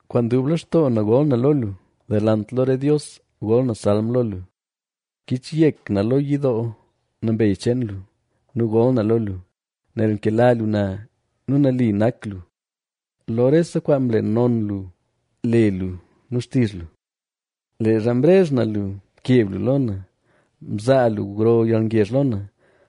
Kwaan dub lextoo na gol na lo lu; delant lo re dios gol na salm lo lu. Kichyek na lo yidoo nambey cheen lu nu gol na lo lu, nel nkela lu na nu nali nak lu. Lo rese kwaan mle non lu le lu nu xtizh lu. Leezha mrezh na lu, mkeb lu lo na; mzaa lu gro yalngezh lo na.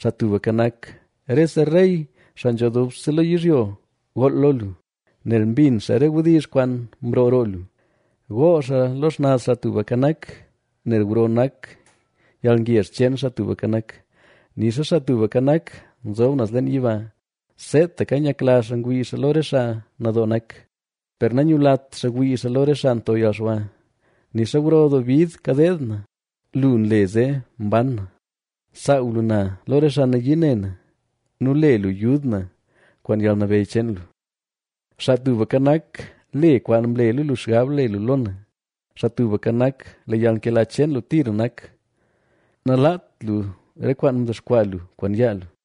Xaa Tubka Nak, rese rey xaa nzho dubse lo yizhyo gool lo lu, nel mbin xaa re wdizh kwaan mroo roo lu. Gool xaa lo xnaz Xaa Tubka Nak, nel gro nak yalngezh cheen Xaa Tubka Nak. Nixa Xaa Tubka Nak, nzob naz leen yiba, seetaka nyakla xaa ngwii xaa lo re xaa nadoo nak, per nanyulat xaa wii xaa lo re xaa nto yalxwa. Nixa gro doo bid kadeed na, lu nle zee mban na; nsaaw lu na lo re xaa nayii ne na nu le lu yud na kwaan yalnabeyy cheen lu. Xaa Tubka Nak, le kwaan mlela lu xgab le lu lo na. Xaa Tubka Nak, lee yalnkela cheen lu tira nak; nalaat lu re kwaan mdexkwaa lu kwaan yaa lu.